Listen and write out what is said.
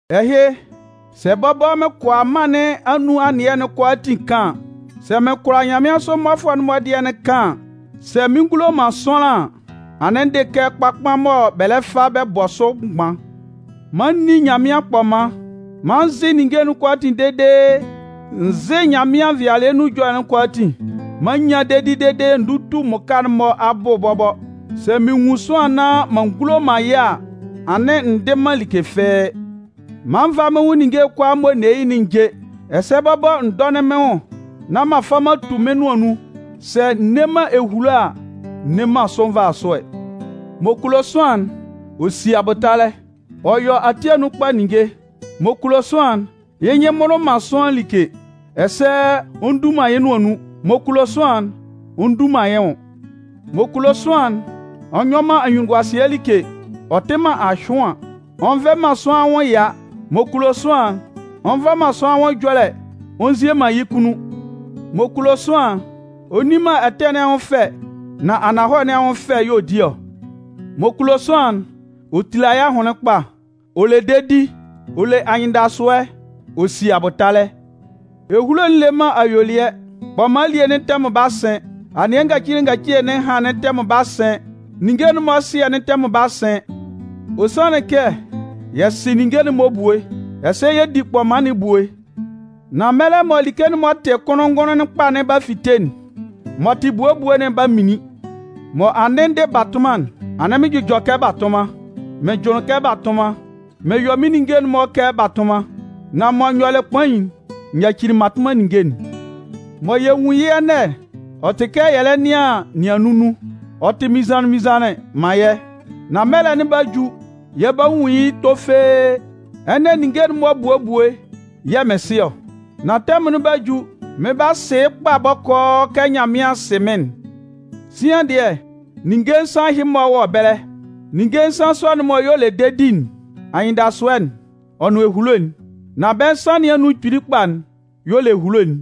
Ɛhɩ, sɛ bɔbɔ mɩn kʋala mân nɩn anun anɩɛ'n-mɔ kʋalaatin kan an, sɛ mɩn kʋala nyanmɩansʋ mmɔfʋɛ'n-mɔ dɩɛ'n kan an, sɛ mɩn ngulo man sʋanlan an, anɩn n dɩ kɛ kpakpan mɔ bɛ lɛ fa bɛ bɔ sʋ mgban. Man n ní Nyanmɩan kpɔman, man n zɩ́ ninnge'n kʋalaatin dede n zɩ́ Nyanmɩan nvɩalɩɛ nun ɛjɔlɛ'n kʋalaatin, man n nyán dedi dede n dútu mmʋka'n-mɔ abʋ bɔbɔ, sɛ mɩn nwun sʋanlan nán m'an ngulo man yɩ́ a, anɩn n dɩ man like fɩ́ɩ́. Man n vá mɩ́n nwʋn ninnge'n kʋalaa mɔ n ne yɩ́'n n jé, ɛsɛ bɔbɔ n dɔ́nɩn mɩ́n nwʋn nán m'an fa m'an tu mɩ́n nʋan nun, sɛ n nne man ehulo a, n nne man sʋ nvasʋɛ. M'ɔ kulo sʋanlan'n, ɔ si abʋtalɛ, ɔ yɔ ati anun kpa ninnge. M'ɔ kulo sʋanlan'n, yɩ́ nyɩn mmʋlʋ man sʋanlan like, ɛsɛ ɔ ndu man yɩ́ nʋan nun. M'ɔ kulo sʋanlan'n, ɔ ndu man yɩ́ nwʋn. M'ɔ kulo sʋanlan'n, ɔ nyɔ man anyunnunguasɩɛ like, ɔ tɩ man ahyʋan. Ɔ nvɛ man sʋanlan anwʋn ɛya. M'ɔ kulo sʋanlan'n, ɔ nva man sʋanlan anwʋn ɛjɔlɛ ɔ nzie man yɩ́ kunnun. M'ɔ kulo sʋanlan'n, ɔ nni man ɛtɛ nɩn anwʋn fɛ nan ananhɔlɛ nɩn anwʋn fɛ y'ɔ di ɔ. M'ɔ kulo sʋanlan'n, ɔ tila yɩ́ ahʋnlɩn kpa, ɔ le dedi, ɔ le anyɩndasʋɛ, ɔ si abʋtalɛ. Ehulo'n le man ayuelɩɛ. Kpɔman elie'n tɛmʋn 'ba sɩn, anɩɛ ngacile ngacile nɩn ɛhan'n tɛmʋn 'ba sɩn, ninnge'n-mɔ ɛsɩɛ'n tɛmʋn 'ba sɩn. Ɔ sanlɩn kɛ yɛ sɩ ninnge'n-mɔ ebue, ɛsɛ yɛ di kpɔman nɩn ebue. Nan mɛlɛ mɔ like'n m'ɔ tɩ kʋnlʋn-ngʋnlʋn kpa'n 'ba fite'n, m'ɔ tɩ ebue ebue'n 'ba minlin. Mɔ n dɩ batʋnman'n, anɩn mɩn jʋjɔ kɛ batʋnman, mɩn jʋnlɩn kɛ batʋnman, mɩn yɔ mɩ́n ninnge'n-mɔ kɛ batʋnman. Nan mɔ n yɔlɩ kpain'n, n nyacili mmatʋnman ninnge'n. Mɔ yɛ nwun yɩ́ ɛnɛ'n, ɔ tɩ kɛ yɛ lɛ nɩan nɩannun nun. Ɔ tɩ mɩnnzanlɩn-mɩnnzanlɩn man yɛ́. Nan mɛlɛ'n 'ba ju, yɛ 'ba nwun yɩ́ tofee. Ɛnɛ, ninnge'n-mɔ ebue ebue yɛ̂ mɩn sɩ ɔ. Nan tɛmʋn'n 'ba ju, mɩn 'ba sɩ yɩ́ kpa bɔkɔɔ kɛ Nyanmɩan sɩ mɩ́n'n. Sian dɩɛ, ninnge nsan ɛhɩ-mɔ wɔ ɛbɛlɛ. Ninnge nsan sɔ'n-mɔ y'ɔ le dedi'n, anyɩndasʋɛ'n, ɔ nʋn ehulo'n. Nan bɛ́ nsan nɩn anun kpili kpa'n y'ɔ le ehulo'n.